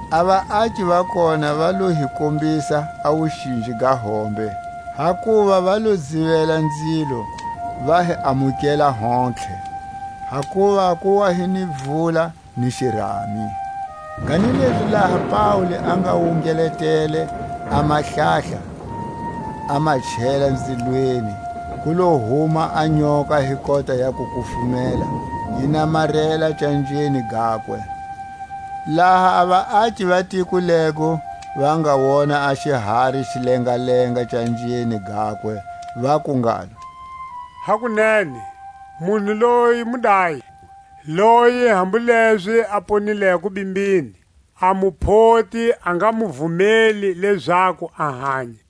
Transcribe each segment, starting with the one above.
A vaaki va kona va lo hi kombisa a wuxinji ga hombe; hakuva va lo dzivela nzilo, va hi amukela hontlhe, hakuva ku wa hi ni vula ni xirami. Kanilezi laha Paule a nga wungeletele a mahlahla, a ma chela nzilweni, ku lo huma a nyoka hi kota ya kukufumela, yi namarela canjeni gakwe. Laha a vaaki va tiko lego va nga wona a xihari xi lengalenga canjeni gakwe, vaku ngalo: Hakunene, munhu loyi mudayi, loyi hambu lezi a ponileko bimbini a Muphoti a nga mu vumeli lezaku a hanya.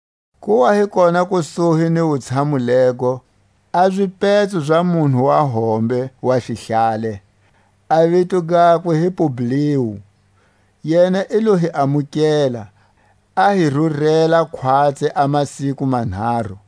Ku wa hi kona kusuhi ni wutshamu lego, a zipetso za munhu wa hombe wa xihlale, a vito gakwe hi Pu-bliu; yena i lo hi amukela, a hi rurela khwatsi a masiku manharu.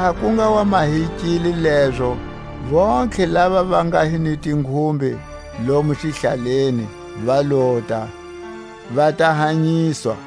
Laha ku nga wa mahekile lezo, vontlhe lava va nga hi ni tinghumbe lomo xihlaleni va lota, va ta hanyiswa.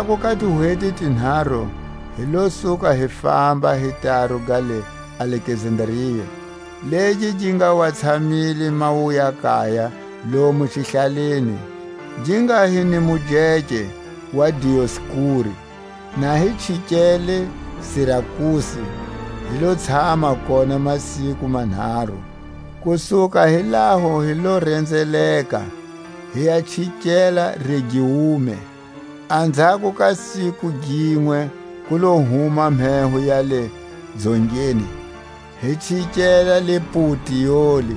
Anzhako ka tihweti tinharu hi lo suka hi famba hi taru ga le Alekzandria, legi gi nga wa tshamile mawuya-kaya lomo xihlaleni, gi nga hi ni mujeke wa Dioskuri. Na hi chikele Sirakuse hi lo tshama kona masiku manharu. Ku suka hi laho hi lo renzeleka, hi ya chikela Regiume; anzhako ka siku ginwe ku lo huma mheho ya le Dzongeni, hi chikela le Puteoli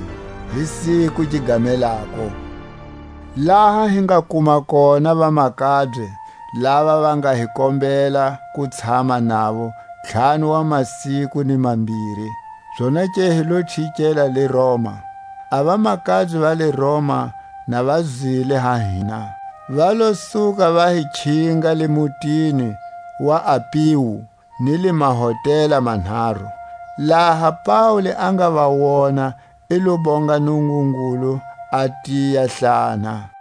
hi siku gi gamelako, laha hi nga kuma kona vamakabye lava va nga hi kombela ku tshama navo ntlhanu wa masiku ni mambiri; zonake hi lo chikela le Roma. A vamakabye va le Roma, na va zwile ha hina, va lo suka va hi khinga le mutini wa Apiu ni le Mahotela Manharu; laha Paule a nga va wona i lo bonga Nungungulu, a tiyahlana.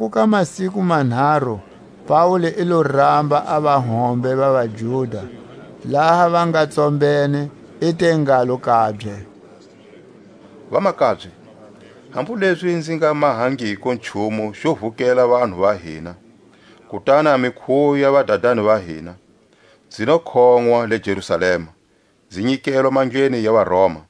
Anzhako ka masiku manharu, Paule i lo ramba a vahombe va vaJuda; laha va nga tsombene i te ngalo kabye: Vamakabye, hambu lezi nzi nga mahangiko nchumu xo vukela vanhu va hina, kutani a mikhuwo ya vadadani va hina, nzi lo khonʼwa le Jerusalema, nzi nyikelwa mandleni ya vaRoma.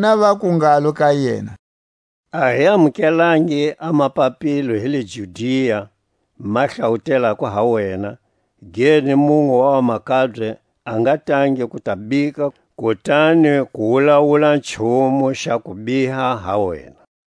Vona vaku ngalo ka yena: A hi amukelangi a mapapilo hi le Judia ma hlawutelako ha wena, ge ni munwe wa vamakabye a nga tangi ku ta bika kutani ku wulawula nchumu xa kubiha ha wena.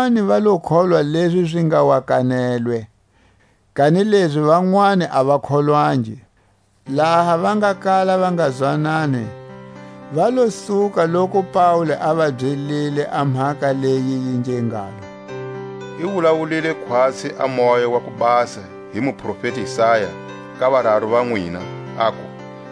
Vanwani va lo kholwa lezi zi nga wa kanelwe, kanilezi vanwani a va kholwangi. Laha va nga kala va nga zwanani, va lo suka loku Paule a va byelile a mhaka leyi yi nge ngalo: I wulawulile khwatsi a Moya wa ku Basa hi muprofeti Isaya ka vararu va nwina, aku: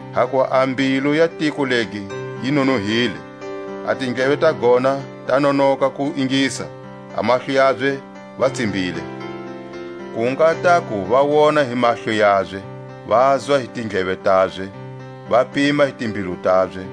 Hakuva a mbilu ya tiko legi yi nonohile, A tindleve ta gona ta nonoka ku ingisa, A mahlo yabye va tsimbile, Ku nga taku va wona hi mahlo yabye, Vazwa hi tindleve tabye, Va pima hi timbilu tabye,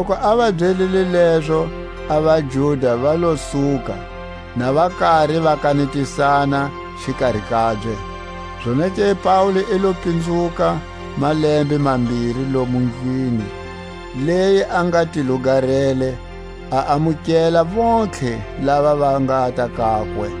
Loku a va byelile lezo, a vaJuda va lo suka, na va kari va kanetisana xikari kabye. Zonake Paule i lo pinzuka malembe mambiri lomu ndlwini leyi a nga ti lugarele, a amukela vontlhe lava va ngata kakwe,